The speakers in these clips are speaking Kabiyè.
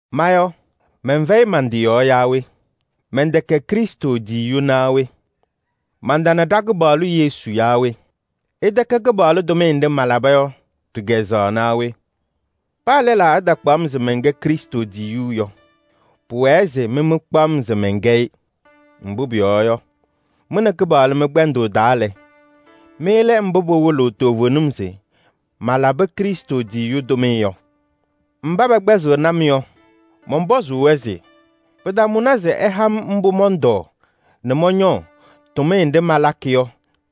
Ma yɔ, mɛnfɛyɩ man-tɩ yɔɔ yaa we? Mɛntɛkɛ Krɩstʋ tiyiyu naa we? Mantana ɖa-Kɩpaɣlʋ Yesu yaa we? Ɩtɛkɛ Kɩpaɣlʋ tʋmɩyɛ nɖɩ malaba yɔ ɖɩ-kazʋwa naa we? Paa lɛlaa ɛtakpaɣ-m se mɛnkɛ Krɩstʋ tiyiyu yɔ, pʋwɛɛ se mɩ mɩkpaɣ-m se mɛnkɛ-ɩ. Mbʋ pʋyɔɔ yɔ, mɩ nɛ Kɩpaɣlʋ mɩ-kpɛndʋʋ taa lɛ, mɩ lɛ mbʋ pɩwɩlɩɣ toovenim se malabɩ Krɩstʋ tiyiyu tʋmɩyɛ yɔ. Mba pɛkpɛɣnɩ-m yɔ, mɔnpɔzʋʋ-wɛ se: pɩtamʋnɩ se ɩha-m mbʋ mɔntɔɔ nɛ mɔñɔɔ tʋmɩyɛ nɖɩ malakɩ yɔ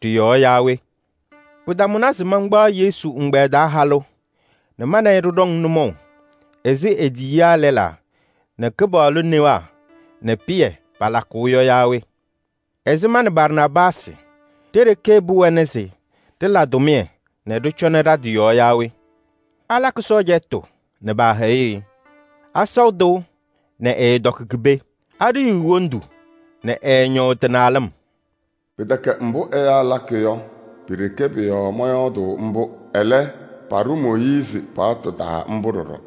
ɖɩ-yɔɔ yaa we? Pɩtamʋnɩ se mankpaɣ Yesu ɛgbɛyɛ taa halʋ nɛ ma nɛ ɩ ɖɩɖɔŋ nʋmɔʋ ɛzɩ e-tiyiyaa lɛlaa nɛ Kɩpaɣlʋ newaa nɛ Pɩyɛ palakʋʋ yɔ yaa we? Ɛzɩ ma nɛ Barnaabaasɩ ɖe-ɖeke pɩwɛnɩ se ɖɩla tʋmɩyɛ nɛ ɖɩcɔnɩ ɖa-tɩ yɔɔ yaa we? Alakɩ sɔɔjatʋ nɛ paahɛyɩɣ-ɩ? Asɔʋ tɩʋ nɛ ɛɛtɔkɩ ki-pee? Aɖiyiɣ wondu nɛ ɛɛñɔʋ tɩ-naalɩm? Pɩtɛkɛ mbʋ ɛyaa lakɩ yɔ, pi-ɖeke pʋ-yɔɔ mɔyɔɔdʋʋ mbʋ. Ɛlɛ, paɖʋ Mooyiizi paɣtʋ taa mbʋ ɖɔɖɔ.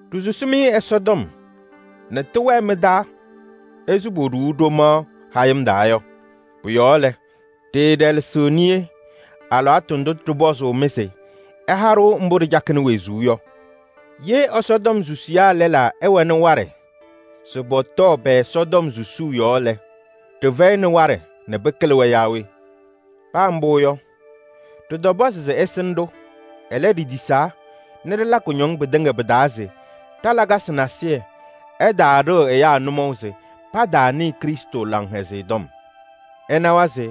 Ɖisusi-mɩ Ɛsɔtɔm nɛ tɩwɛɛ mɩ-taa ɛzɩ poɖuu ɖomaɣ hayɩm taa yɔ. Pʋ-yɔɔ lɛ, ɖɩɩɖɛlɛsɩɣ niye alɩwaatʋ ndʋ ɖɩpɔzʋʋ-mɩ se ɩha-ɖʋ mbʋ ɖɩcakɩnɩ wezuu yɔ. Ye Ɛsɔtɔm susiyaa lɛlaa ɛwɛnɩ waɖɛ se pɔtɔɔ pɛ-Ɛsɔtɔm susuu yɔɔ lɛ, ɖɩfɛyɩnɩ waɖɛ nɛ pɩkɩlɩ-wɛ yaa we? Paa mbʋ yɔ, ɖɩtɔpɔzɩ-mɩ se ɩsɩnɩ-ɖʋ. Ɛlɛ, ɖitisaa nɛ ɖɩla kʋñɔŋ pɩtɩŋa pɩ-taa se ɖa-lakasɩ nasɩyɩ ɛtaaɖɩɣ ɛyaa nʋmɔʋ se pataanɩɩ Krɩstʋ Laŋhɛzɩyɛ Tɔm. Ɩnawa se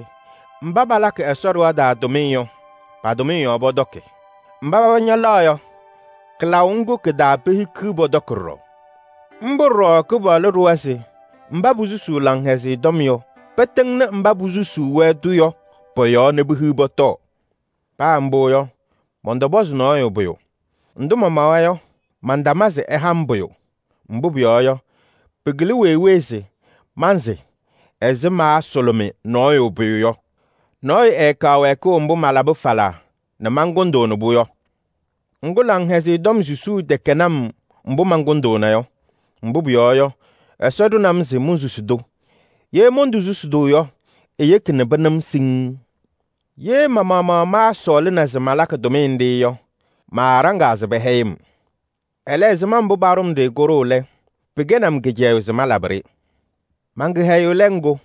mba palakɩ Ɛsɔ ɖɩɣa taa tʋmɩyɛ yɔ, pa-tʋmɩyɛ yɔɔ pɔtɔkɩ. Mba paba ñalaɣ yɔ, kɩlaʋ ŋgʋ kɩ-taa pehikiɣ pɔtɔkɩ ɖɔɖɔ. Mbʋ ɖɔɖɔ Kɩpaɣlʋ ɖʋwa se mba posusuu Laŋhɛzɩyɛ Tɔm yɔ, pɩtɩŋnɩ mba posusuu-wɛ-tʋ yɔ pɔ-yɔɔ nɛ pehiɣ pɔtɔɔ. Paa mbʋ yɔ, mɔntɔpɔzɩ nɔɔyʋ pʋyʋ. Ndʋ mamawa yɔ, mantama se ɩha-m pʋyʋ. Mbʋ pʋyɔɔ yɔ, pɩkɩlɩ wee wee se mansɩ ɛzɩ maasʋlʋmɩ nɔɔyʋ pʋyʋ yɔ: nɔɔyʋ ɛɛkaɣ wɛɛkʋʋ mbʋ malabɩ falaa nɛ mankʋndʋʋnɩ-pʋ yɔ. Ŋgʋ, Laŋhɛzɩyɛ Tɔm susuu tɛkɛnɩ-m mbʋ mankʋndʋʋna yɔ. Mbʋ pʋyɔɔ yɔ, Ɛsɔ ɖʋnɩ-m se monsusi-tʋ. Ye montosusi-tʋ yɔ, eyeki nɛ pɩnɩ-m siŋŋ. Ye ma-maɣmaɣ maasɔɔlɩna se malakɩ tʋmɩyɛ nɖɩ yɔ, maaɖaŋaa se pɛhɛyɩ-m. Ɛlɛ, ɛzɩma mbʋ paɖʋ-m-ɖɩ kʋɖʋʋ lɛ, pɩkɛnɩ-m kɩcɛyʋʋ se malabɩ-ɖɩ. Man-kɩhɛyʋʋ lɛ ŋgʋ yɔ?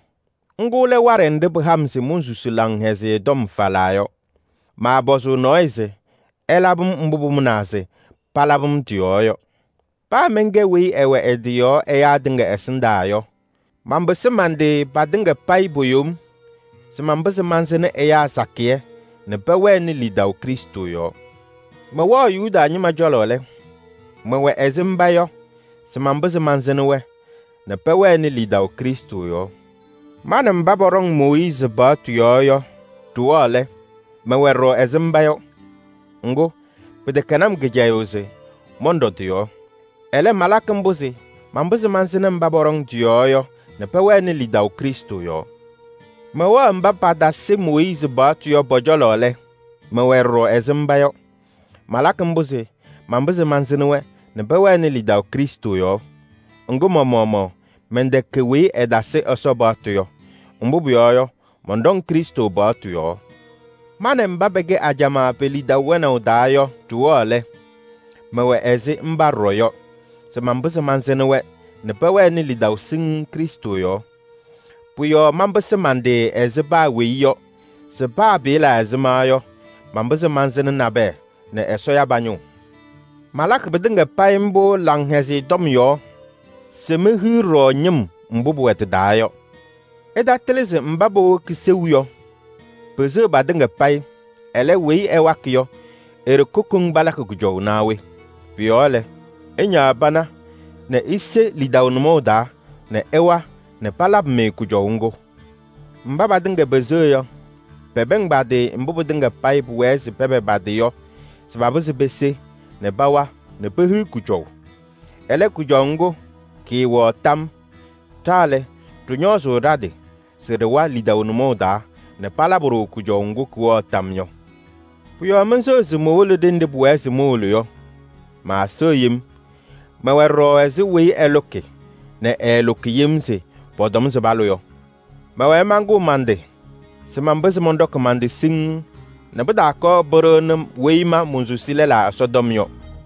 Ŋgʋ lɛ waɖɛ nɖɩ pɩha-m se monsusuu Laŋhɛzɩyɛ Tɔm falaa yɔ. Maapɔzʋʋ nɔɔyʋ se ɛlabɩ-m mbʋ pʋmʋnaa se palabɩ-m tɩ-yɔɔ yɔ. Paa mɛnkɛ weyi ɛwɛ ɛ-tɩ yɔɔ ɛyaa tɩŋa ɛsɩndaa yɔ, manpɩsɩ man-tɩ patɩŋa payɩ po-yom se manpɩzɩ mansɩnɩ ɛyaa sakɩyɛ nɛ pɛwɛnɩ lidaʋ Krɩstʋ yɔɔ. Mɛwɛɣ Yuda ñɩma cɔlɔ lɛ, mɛwɛ ɛzɩ mba yɔ se manpɩzɩ mansɩnɩ-wɛ nɛ pɛwɛnɩ lidaʋ Krɩstʋ yɔɔ. Ma nɛ mba pɔɖɔŋ Mooyiizi paɣtʋ yɔɔ yɔ ɖɩwɛɣ lɛ, mɛwɛ ɖɔɖɔ ɛzɩ mba yɔ. Ŋgʋ, pɩtɛkɛnɩ-m kɩcɛyʋʋ se mɔnɖɔ tɩ-yɔɔ. Ɛlɛ, malakɩ mbʋ se manpɩzɩ mansɩnɩ mba pɔɖɔŋ tɩ-yɔɔ yɔ nɛ pɛwɛnɩ lidaʋ Krɩstʋ yɔɔ. Mɛwɛɣ mba patasɩ Mooyiizi paɣtʋ yɔ pɔ-cɔlɔ lɛ, mɛwɛ ɖɔɖɔ ɛzɩ mba yɔ. Malakɩ mbʋ se manpɩzɩ mansɩnɩ-wɛ nɛ pɛwɛnɩ lidaʋ Krɩstʋ yɔɔ. Ŋgʋ, ma-maɣmaɣ mɛntɛkɛ weyi ɛtasɩ Ɛsɔ paɣtʋ yɔ. Mbʋ pʋyɔɔ yɔ, mɔnɖɔŋ Krɩstʋ paɣtʋ yɔɔ. Ma nɛ mba pɛkɛ ajamaa pe-lidaʋ wɛnaʋ taa yɔ ɖɩwɛɣ lɛ, mɛwɛ ɛzɩ mba ɖɔɖɔ yɔ se manpɩzɩ mansɩnɩ-wɛ nɛ pɛwɛnɩ lidaʋ siŋŋ Krɩstʋ yɔɔ. Pʋ-yɔɔ manpɩsɩ man-tɩ ɛzɩ paa weyi yɔ se paa pɩɩla ɛzɩma yɔ, manpɩzɩ mansɩnɩ nabɛyɛ nɛ Ɛsɔ ya pa-ñʋʋ. Malakɩ pɩtɩŋa payɩ mbʋ Laŋhɛzɩyɛ Tɔm yɔɔ se mehiɣ ɖɔɖɔ ñɩm mbʋ pʋwɛ tɩ-taa yɔ. Ɩtatɩlɩ se mba powoki seu yɔ, peseɣ patɩŋa payɩ, ɛlɛ, weyi ɛwakɩ yɔ e-ɖeke koŋ palakɩ kʋjɔʋ naa we? Pʋ-yɔɔ lɛ, ɩñaɣ pana nɛ ise lidaʋ nʋmɔʋ taa nɛ ɩwa nɛ palabɩ-mɩ kʋjɔʋ ŋgʋ. Mba patɩŋa peseɣ yɔ, pɔsɔŋ mbʋ pɩtɩŋa payɩ pʋwɛɛ se pɔsɔ yɔ se pese nɛ pawa nɛ pehiɣ kʋjɔʋ. Ɛlɛ, kʋjɔʋ ŋgʋ kɩɩwɛɣ tam. Ɖa lɛ, ɖɩñɔɔzʋʋ ɖa-tɩ se ɖɩwa lidaʋ nʋmɔʋ taa nɛ palabɩ-ɖʋ kʋjɔʋ ŋgʋ kɩwɛɣ tam yɔ. Pʋ-yɔɔ menseɣ se mowolo ɖenɖe pʋwɛɛ se mowolo yɔ, maaseɣ yem. Mɛwɛ ɖɔɖɔ ɛzɩ weyi ɛlʋkɩ nɛ ɛɛlʋkɩ yem se pɔtɔm se palʋ yɔ. Mɛwɛɛ mankʋʋ man-tɩ se manpɩzɩ mɔnɖɔkɩ man-tɩ siŋŋ nɛ pɩtaakɔɔ pɩɖɩɣnɩ weyi ma monsusi lɛlaa Ɛsɔtɔm yɔ.